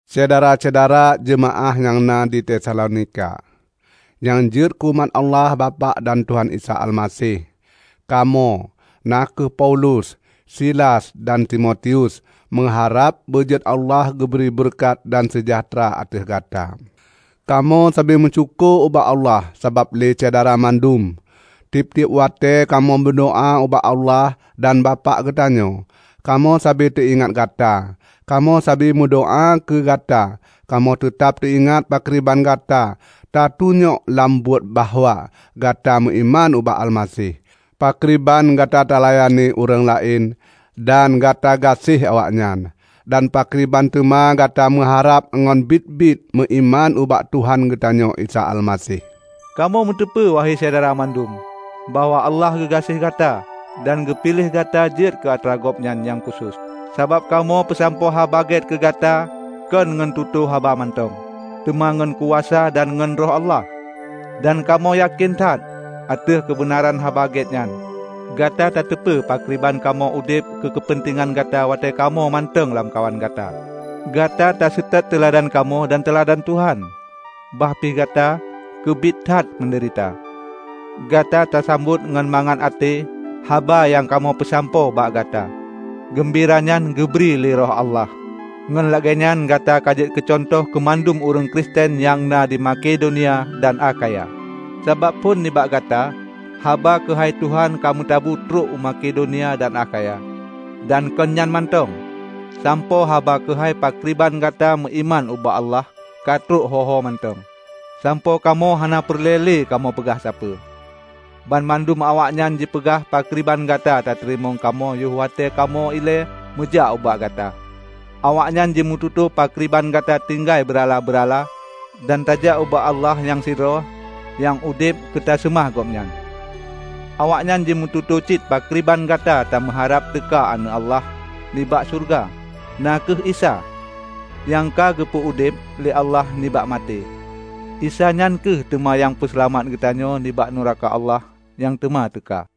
Syedara-syedara jeumaáh nyang na di Tesalonika, nyang jeuet keu umat Allah Bapak dan Tuhan Isa Almaseh: Kamoe, na kheueh Paulus, Silas dan Timotius meuharab beujeuet Allah geubri beureukat dan seujahteura ateueh gata. Kamoe sabe meusyukoe ubak Allah sabab lé Syedara mandum. Tieb-tieb watée kamoe meudoá ubak Allah dan Bapak geutanyoe, kamoe sabe teuingat gata. Kamoe sabe meudoá keu gata Kamoe teutab teuingat pakriban gata tatunyok lam buet bahwa gata meuiman ubak Almaseh, pakriban gata talayani ureuëng laén dan gata gaséh awaknyan, dan pakriban teuma gata meuharab ngon biet-biet meuiman ubak Tuhan geutanyoe Isa Almaseh. Kamoe meuteupeue, wahe Syedara mandum, bahwa Allah geugaséh gata dan ka geupiléh gata jeuet keu atra Gobnyan nyang khusos. Sabab kamoe peusampoe Haba Gét keugata kon ngon tutoe haba mantong, teuma ngon kuasa dan ngon Roh Allah. Dan kamoe yakén that ateueh keubeunaran Haba Gét nyan. Gata tateupeue pakriban kamoe udeb keu keupeuntengan gata watée kamoe mantong na lamkawan gata. Gata taseutôt teuladan kamoe dan teuladan Tuhan. Bah pih gata keubiet that meudeurita, gata tasambot ngon mangat até haba nyang kamoe peusampoe bak gata. Geumbira nyan geubri lé Roh Allah. Ngon lagée nyan gata kajeuet keucuntoh keumandum ureuëng Kristen nyang na di Makedonia dan Akhaya. Sabab phon nibak gata, haba keuhai Tuhan ka meutabu trok u Makedonia dan Akhaya. Dan kon nyan mantong; sampoe haba keuhai pakriban gata meuiman ubak Allah ka trok ho-homantong, sampoe kamoe hana peureulée lé kamoe peugah sapeue. Banmandum awaknyan jipeugah pakriban gata tateurimong kamoe yoh watée kamoe ilée meujak ubak gata. Awaknyan jimeututoe pakriban gata tatinggai beurala-beurala dan tajak ubak Allah nyang sidroe nyang udeb keuteuseumah Gobnyan. Awaknyan jimeututoe cit pakriban gata tameuharab teuka Aneuëk Allah nibak syeuruga, na kheueh Isa, nyang ka geupeu udeb lé Allah nibak maté. Isa nyan kheueh teuma nyang peuseulamat geutanyoe nibak meureuka Allah nyang teuma teuka.